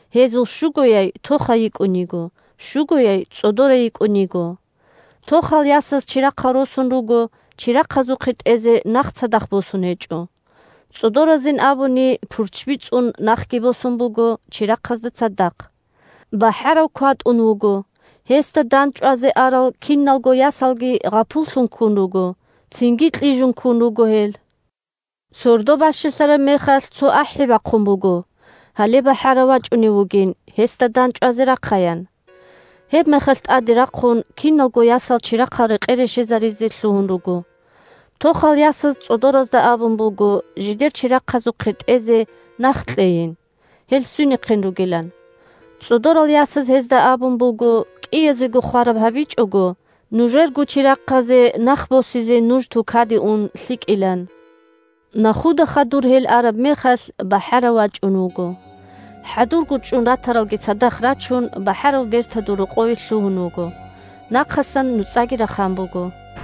Гьезул щугояй тохай йикӀун йиго, щугояй цӀодорай йикӀун йиго. Тохал ясаз чирахъал росун руго, чирахъазухъе тӀезе нах цадахъ босун гьечӀо. ЦӀодоразин абуни, пурччби цӀун нахги босун буго чирахъазда цадахъ. БахӀарав кватӀун вуго, гьесда дандчӀвазе арал киналго ясалги гъапуллъун ккун руго, цинги кьижун ккун руго гьел. Сордо бащалъараб мехалъ, цо ахӀи бахъун буго, гьале бахӀарав вачӀунев вугин, гьесда дандчӀвазе рахъаян. Гьебмехалъ, тӀаде рахъун, киналго ясал чирахъал рекъе-решезаризе лъугьун руго. Тохал ясаз цӀодоразда абун буго жидер чирахъазухъе тӀезе нах кьейин, гьел свинехъин ругилан. ЦӀодорал ясаз гьезда абун буго, кӀиязего хвараб гьабичӀого, нужерго чирахъазе нах босизе нуж тукаде ун лъикӀилан. Нахуда хадур гьел араб мехалъ, бахӀарав вачӀун вуго. ХӀадурго чӀун ратаралги цадахъ рачун, бахӀарав бертадул рокъове лъугьун вуго. Нахъасан нуцӀаги рахан буго.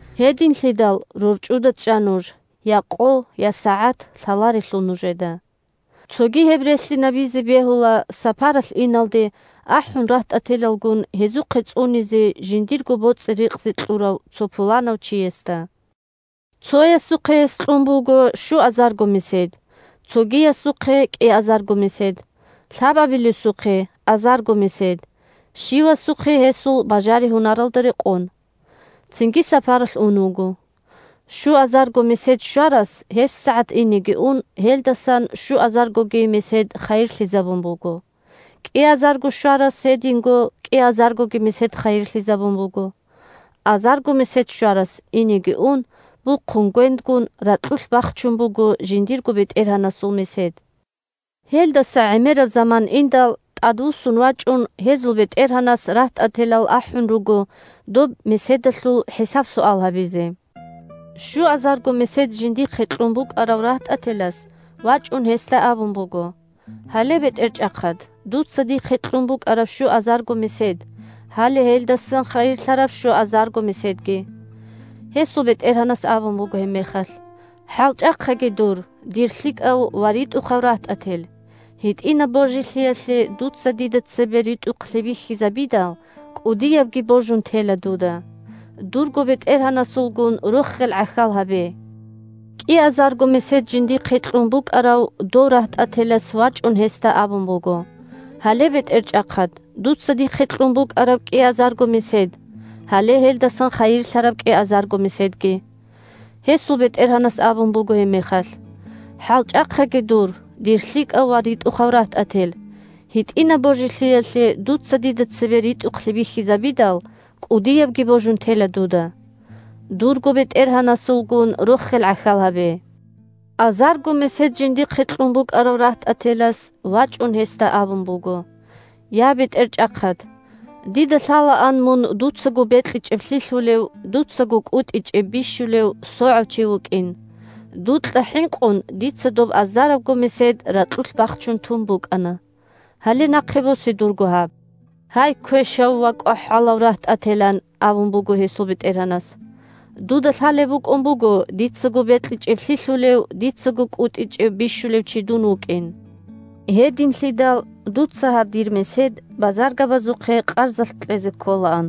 Гьединлъидал, рорчӀуда чӀа нуж: я къо, я сагӀат лъаларелъул нужеда. Цоги гьеб релълъинабизе бегьула сапаралъ иналде, ахӀун рагьтӀателалгун, гьезухъе цӀунизе жиндирго боцӀи-рикъзи кьурав цо пуланав чиясда. Цоясухъе гьес кьун буго щуазарго месед, цогиясухъе – кӀиазарго месед, лъабабилесухъе – азарго месед, – щивасухъе гьесул бажари-гьунаралда рекъон. Цинги сапаралъ ун вуго. Щуазарго месед щварас, гьебсагӀат инеги ун, гьелдасан щуазаргоги месед хайирлъизабун буго. КӀиазарго щварас гьединго кӀиазаргоги месед хайирлъизабун буго. Азарго месед щварас, инеги ун, бухъун гвендгун, ракьулъ бахчун буго жиндирго бетӀергьанасул месед. Гьелдаса гӀемераб заман индал, тӀадвуссун вачӀун, гьезул бетӀергьанас рагьтӀателал ахӀун руго доб меседалъул хӀисаб-суал гьабизе. Щуазарго месед жиндихъе кьун букӀарав рагьтӀателас, вачӀун гьесда абун буго: «Гьале, бетӀерчӀахъад, дуца дихъе кьун букӀараб щуазарго месед, гьале гьелдасан хайирлъараб щуазарго меседги». Гьесул бетӀергьанас абун буго гьебмехалъ: «ХӀалчӀахъаги дур, дир лъикӀав ва ритӀухъав рагьтӀател, гьитӀинаб божилъиялъе дуца дида цебе ритӀухълъи бихьизабидал, кӀудиябги божун тела дуда. Дурго бетӀергьанасулгун рохел гӀахьал гьабе». КӀиазарго месед жиндихъе кьун букӀарав дов рагьтӀателас вачӀун гьесда абун буго: «Гьале, бетӀерчӀахъад, дуца дихъе кьун букӀараб кӀиазарго месед, гьале гьелдасан хайирлъараб кӀиазарго меседги». Гьесул бетӀергьанас абун буго гьебмехалъ: «ХӀалчӀахъаги дур, дир лъикӀав ва ритӀухъав рагьтӀател, гьитӀинаб божилъиялъе дуца дида цебе ритӀухълъи бихьизабидал, кӀудиябги божун тела дуда. Дурго бетӀергьанасулгун рохел гӀахьал гьабе». Азарго месед жиндихъе кьун букӀарав рагьтӀателас вачӀун гьесда абун буго: «Я, бетӀерчӀахъад! Дида лъалаан мун дуцаго бекьичӀеб лъилъулев, дуцаго кӀутӀичӀеб бищулев, согӀав чи вукӀин. Дукьа хӀинкъун, дица доб азарабго месед ракьулъ бахчун тун букӀана. Гьале нахъе босе дурго гьаб». «Гьай, квешав ва кӀвахӀалав рагьтӀател! – ан абун буго гьесул бетӀергьанас. – Дуда лъалеб букӀун буго дицаго бекьичӀеб лъилъулев, дицаго кӀутӀичӀеб бищулев чи дун вукӀин. Гьединлъидал дуца гьаб дир месед базаргабазухъе къарзалъ кьезе кколаан.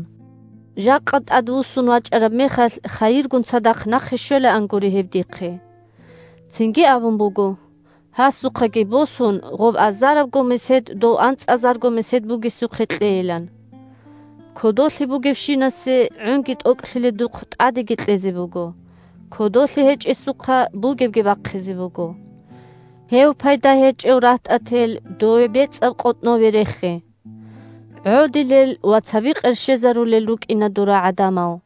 Жакъа тӀадвуссун вачӀараб мехалъ, хайиргун цадахъ нахъе щвелаангури гьеб дихъе». Цинги абун буго, гьасухъаги босун, гъоб азарабго месед дов анцӀазарго месед бугесухъе кьейилан. «Кодолъи бугевщинасе, гӀунги тӀокӀлъиледухъ, тӀадеги кьезе буго, кодолъи гьечӀесухъа бугебги бахъизе буго. Гьев пайда гьечӀев рагьтӀател дове бецӀаб къотӀнове рехе. ГӀодилел ва цаби къерщезарулел рукӀина дора гӀадамал».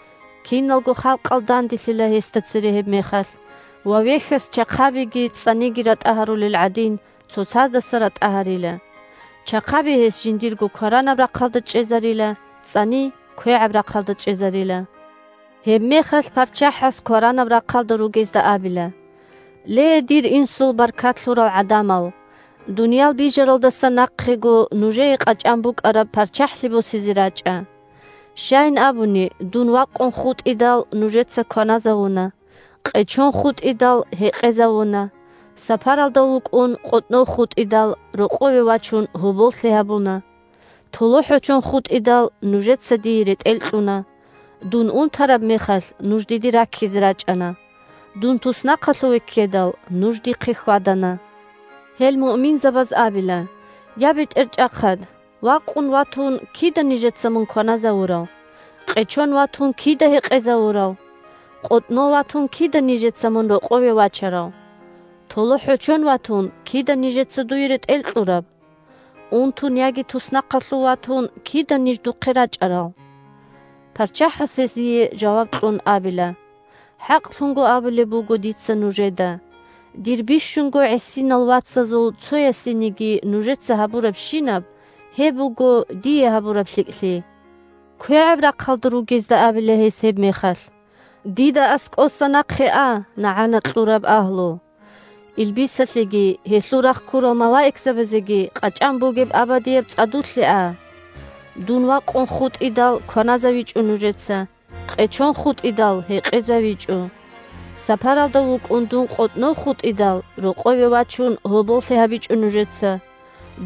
Киналго халкъал данделъила гьесда цере гьебмехалъ, ва вехьас чахъабиги цӀцӀаниги ратӀа гьарулел гӀадин, цоцаздаса ратӀа гьарила. Чахъаби гьес жиндирго кваранаб рахъалда чӀезарила, цӀцӀани квегӀаб рахъалда чӀезарила. Гьебмехалъ ПарччахӀас кваранаб рахъалда ругезда абила: «Ле, дир Инсул баркат лъурал гӀадамал, дуниял бижаралдаса нахъего нужее къачӀан букӀараб ПарччахӀлъи босизе рачӀа. Щайин абуни, дун вакъун хутӀидал – нужеца кваназавуна, къечон хутӀидал – гьекъезавуна, сапаралда вукӀун, къотӀнов хутӀидал – рокъове вачун, гьоболлъи гьабуна. ТолохӀочон хутӀидал – нужеца дие ретӀел кьуна; дун унтараб мехалъ – нуж диде раккизе рачӀана; дун туснахъалъуве ккедал – нуж дихъе хьвадана». Гьел муъминзабаз абила: «Я, БетӀерчӀахъад! Вакъун ватун – кида нижеца мун кваназавурав? Къечон ватун – кида гьекъезавурав? КъотӀнов ватун – кида нижеца мун рокъове вачарав? ТолохӀочон ватун – кида нижеца дуе ретӀел кьураб? Унтун яги туснахъалъув ватун – кида ниж духъе рачӀарал?» ПарччахӀас, гьезие жаваб кьун, абила: «ХӀакълъун абулеб буго дица нужеда: дир бищунго гӀисинал вацазул цоясениги нужеца гьабурабщинаб, гьеб буго дие гьабураб лъикӀлъи». КвегӀаб рахъалда ругезда абила гьес гьебмехалъ: «Дида аскӀоса нахъе а, нагӀана кьураб агьлу! Илбисалъеги гьелъул рахъ ккурал малаикзабазеги къачӀан бугеб абадияб цӀадулъе а. Дун вакъун хутӀидал – кваназавичӀо нужеца, къечон хутӀидал – гьекъезавичӀо. Сапаралда вукӀун дун къотӀнов хутӀидал – рокъове вачун, гьоболлъи гьабичӀо нужеца,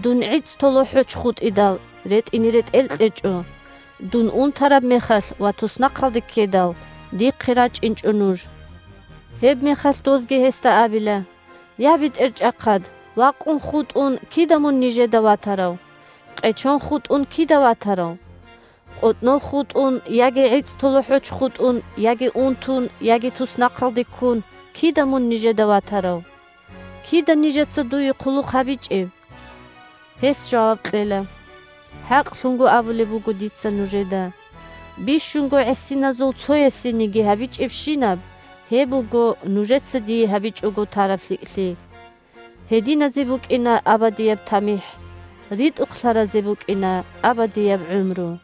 дун гӀицӀтолохӀоч хутӀидал – ретӀине ретӀел кьечӀо, дун унтараб мехалъ ва туснахъалде ккедал – дихъе рачӀинчӀо нуж». Гьебмехалъ дозги гьесда абила: «Я, БетӀерчӀахъад! Вакъун хутӀун – кида мун нижеда ватарав? Къечон хутӀун – кида ватарав? КъотӀнов хутӀун, яги гӀицӀтолохӀоч хутӀун, яги унтун, яги туснахъалде ккун – кида мун нижеда ватарав? Кида нижеца дуе хъулухъ гьабичӀеб?» Гьес жаваб кьела: «ХӀакълъун абулеб буго дица нужеда: бищунго гӀисиназул цоясениги гьабичӀебщинаб, гьеб буго нужеца дие гьабичӀого тараб лъикӀлъи». Гьединазе букӀина абадияб тамихӀ, ритӀухълъаразе букӀина абадияб гӀумру!